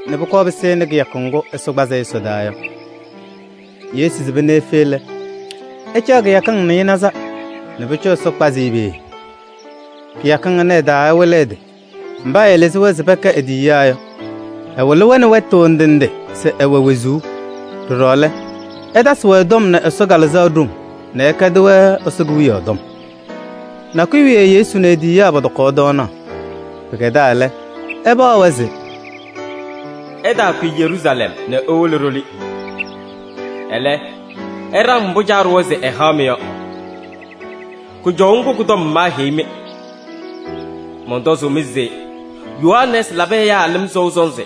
nɛ pʋkɔɔ pɩsɩnɩ kɩyakʋ ŋgʋ Ɛsɔ kpazɩ-ɩ ɛsɔdaa yɔ. Yesu sɩba nɛ efe lɛ, ɛcaɣ kɩyakɩŋ nɩɩnaza nɛ pʋcɔ Ɛsɔ kpazɩ-ɩ peeye. Kɩyakɩŋ ɩnʋ ɩ-taa ɛwɩlɩ ɛ-tɩ mba ɛɛlɩzɩ-wɛ se pɛkɛ e-tiyiyaa yɔ. Ɛwɩlɩ-wɛ nɛ wɛtʋ ndɩ ndɩ se ɛwɛ wezuu. Ɖɔɖɔ lɛ, ɛtasɩ-wɛ tɔm nɛ Ɛsɔ Kalɩzaɣ ɖoŋ nɛ ɛkɛdɩ-wɛ Ɛsɔ Kewiyaɣ tɔm. Nakʋyʋ wiye Yesu nɛ e-tiyiyaa pɔtɔkaɣ tɔɔnaɣ. Pɩkɛdaa lɛ, ɛpaɣ-wɛ se: “Ɩtaakʋyɩ Yeruusalɛm nɛ iwolo ɖoli. Ɛlɛ, ɩɖaŋ mbʋ Caa ɖʋwa se ɛhaɣ-mɩ yɔ. Kʋjɔʋ ŋgʋ kʋ-tɔm maaheyi-mɩ. Mɔntɔzʋʋ-mɩ se Yohanɛɛsɩ labɩ ɛyaa lɩm sɔʋ sɔnzɩ.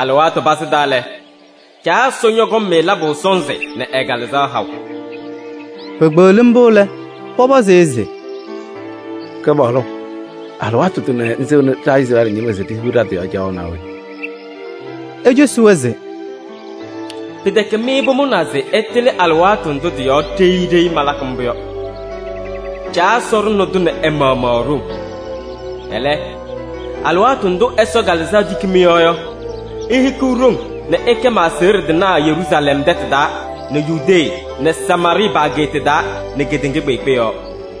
Alɩwaatʋ pazɩ taa lɛ, Caa Ɛsɔ ñɔkɔŋ-mɩ labʋ sɔnzɩ nɛ ɛ-Kalɩzaɣ haʋ.” Pekpeɣli mbʋ lɛ, pɔpɔzɩ-ɩ se: “Kɩpaɣlʋ! Alɩwaatʋ tʋnɛ ŋsɩŋnɩ ɖa Izrɛɛlɩ ñɩma se ɖihiɣ ɖa-tɩ yɔɔ caɣʋ naa we?” Ecosi-wɛ se: “Pɩtɛkɛ mɩ pʋmʋnaa se ɩtɩlɩ alɩwaatʋ ndʋ tɩ-yɔɔ ɖeyi ɖeyi malakɩ mbʋ yɔ. Caa Ɛsɔ ɖʋnɩ-tʋ nɛ ɛ-maɣmaɣ e-ɖoŋ. Ɛlɛ, alɩwaatʋ ndʋ Ɛsɔ Kalɩzaɣ tiki mɩ-yɔɔ yɔ, ihikiɣ ɖoŋ nɛ ɩkɛ ma-aseɣɖe tɩnaa Yeruusalɛm tɛtʋ taa nɛ Yudee nɛ Samaarɩɩ pa-ageeta taa nɛ kedeŋa kpeekpe yɔɔ.”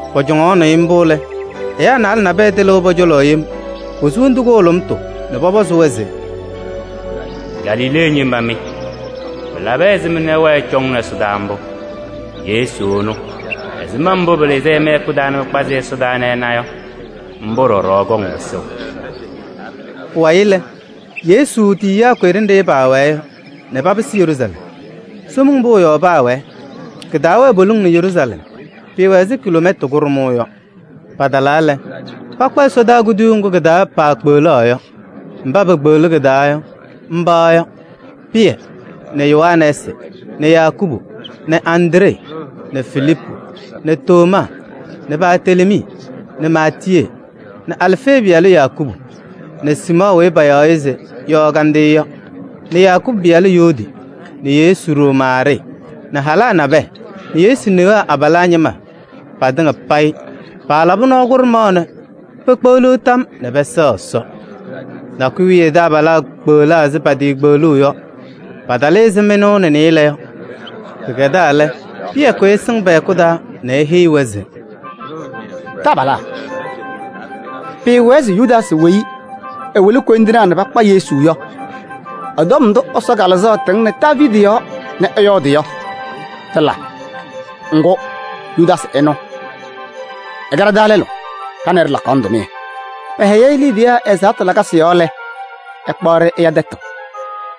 Pɔcɔŋaɣnɩ-ɩ mbʋ lɛ, ɛyaa naalɛ nabɛyɛ tɩlɩʋ pɔ-cɔlɔ yem, posu wondu kʋhʋlʋmtʋ nɛ pɔpɔzʋʋ-wɛ se: “Galilee ñɩma mɩ! Pɩlabɩ ɛzɩma nɛ ɩwɛɛ ɩcɔŋnɩ ɛsɔdaa mbʋ? Yesu ɛnʋ, ɛzɩma mbʋ pɩlɩzɩ-ɩ mɩ-hɛkʋ taa nɛ pɩkpazɩ-ɩ ɛsɔdaa nɛ ɩna yɔ, mbʋ ɖɔɖɔ ɛkɔŋ pɩsʋʋ.” Pʋwayɩ lɛ, Yesu tiyiyaa kʋyɩ ɖenɖe paawɛɛ yɔ nɛ papɩsɩ Yeruusalɛm. Somiŋ Pʋʋ yɔɔ paawɛɛ. Kɩtaawɛɛ poliŋ nɛ Yeruusalɛm, pɩɩwɛ ɛzɩ kiloomɛta kʋɖʋmʋʋ yɔ. Patalaa lɛ, pakpa ɛsɔdaa kuduyuu ŋgʋ kɩ-taa paakpeɣlaɣ yɔ. Mba pekpeɣlaɣ kɩ-taa yɔ, mba yɔ: Pɩyɛ nɛ Yohanɛɛsɩ nɛ Yakubu nɛ Andree nɛ Filiipu nɛ Tomaa nɛ Bartelemii nɛ Maatiyee nɛ Alfee pɩyalʋ Yakubu nɛ Siimɔɔ weyi payaɣ se Yɔɔ Kandɩyʋ yɔ nɛ Yakubu pɩyalʋ Yuudi nɛ Yesu ɖoo Maarɩɩ nɛ halaa nabɛyɛ nɛ Yesu newaa abalaa ñɩma patɩŋa payɩ paalabɩ nɔɔ kʋɖʋmaɣ nɛ pekpeɣliɣ tam nɛ pɛsɛɣ Ɛsɔ. Nakʋyʋ wiye taabalaa kpeɣlaa ɛzɩ patiikpeɣluu yɔ, paatalɩ ɛzɩ mɩnʋʋ nɛ nɩɩlɛ yɔ. Pɩkɛdaa lɛ, Pɩyɛ kʋyɩ ɛsɩŋ pɛ-hɛkʋ taa nɛ eheyi-wɛ se: “Taabalaa! Pɩɩwɛɛ se Yudaasɩ weyi ɛwɩlɩ koyindinaa nɛ pakpa Yesu yɔ ɛ-tɔm ndʋ Ɛsɔ Kalɩzaɣ tɩŋnɩ Daaviidi yɔɔ nɛ ɛyɔɔdɩ yɔ, tɩla. Ŋgʋ, Yudaasɩ ɛnʋ ɛkɛ ɖa-taa lɛlʋ, ɖa nɛ ɩ ɖɩlakaɣnɩ tʋmɩyɛ. Pɛhɛyɩ-ɩ liidiye ɛ-ɛzaɣtʋ lakasɩ yɔɔ lɛ, ɛkpaɣ-ɖɩ ɛya tɛtʋ.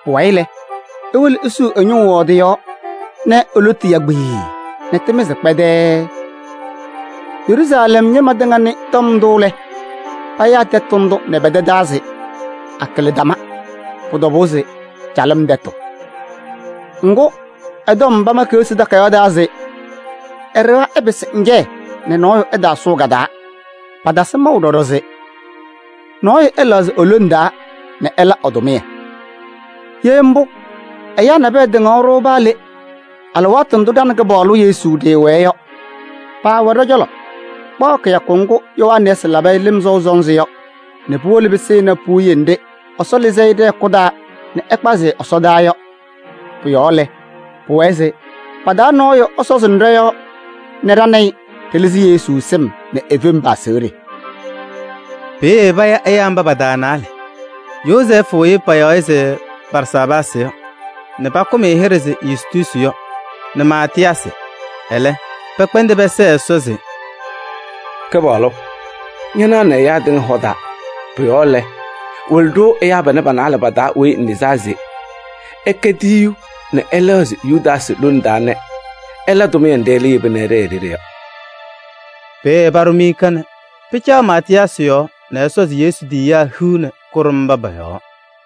Pʋwayɩ lɛ, ewolo esiɣ ɛ-ñʋʋ yɔɔ tɩ-yɔɔ nɛ e-lotu ya kpiii nɛ tɩmɩzɩ kpɛdɛɛɛ. Yeruusalɛm ñɩma tɩŋa nɩ tɔm ndʋ lɛ, payaa tɛtʋ ndʋ nɛ pɛ-tɛ taa se: ‘Akɩlɩdama.’ Pʋ-tɔbʋʋ se calɩm tɛtʋ. Ŋgʋ, ɛ-tɔm pama Keɣsi Takayaɣ taa se: ‘Ɛ-ɖɩɣa ɛpɩsɩ ŋjɛyɛ nɛ nɔɔyʋ ɛtaatasɩ sʋʋ ka-taa.’ Patasɩ maʋ ɖɔɖɔ se: ‘Nɔɔyʋ ɛlɛɣzɩ e-lone taa nɛ ɛla ɛ-tʋmɩyɛ.’ Ye mbʋ, ɛyaa nabɛyɛ tɩŋaɣ-ɖʋ paa le, alɩwaatʋ ndʋ ɖa nɛ Kɩpaɣlʋ Yesu ɖɩɩwɛɛ yɔ. Paawɛ ɖɔ-cɔlɔ kpaɣ kɩyakʋ ŋgʋ Yohanɛɛsɩ labɩ-ɩ lɩm sɔʋ sɔnzɩ yɔ nɛ puwolo pɩsɩnɩ puwiye nɖɩ Ɛsɔ lɩzɩ-ɩ ɖɛ-hɛkʋ taa nɛ ɛkpazɩ-ɩ ɛsɔdaa yɔ. Pʋ-yɔɔ lɛ, pʋwɛɛ se pa-taa nɔɔyʋ ɛsɔzɩnɩ ɖɔ-yɔɔ nɛ ɖa nɛ ɩ ɖɩlɩzɩ Yesu sɩm nɛ e-fem pa-aseɣɖe.” Peeye paya ɛyaa mba pa-taa naalɛ: Yozɛɛfʋ weyi payaɣ se Barsaabaasɩ nɛ pakʋm-ɩ hɩɖɛ se Yustuusi yɔ nɛ Maatɩyaasɩ. Ɛlɛ pɛkpɛndɩ pɛsɛɛ Ɛsɔ se: “Kɩpaɣlʋ! Ñanaɣnɩ ɛyaa tɩŋa hɔ taa. Pʋ-yɔɔ lɛ, wɩlɩ-ɖʋ ɛyaa panɛ pa-naalɛ pa-taa weyi ŋlɩzaa se ɛkɛ tiyiyu nɛ ɛlɛɣzɩ Yudaasɩ lone taa nɛ ɛla tʋmɩyɛ nɖɩ ɛlɛ yeba nɛ ɛɖɛɛ e-ɖeɖe yɔ.” Peeye paɖʋ miika nɛ pɩcaɣ Maatɩyaasɩ yɔɔ nɛ ɛsɔzɩ Yesu tiyiyaa hiu nɛ kʋɖʋm mba pɔ-yɔɔ.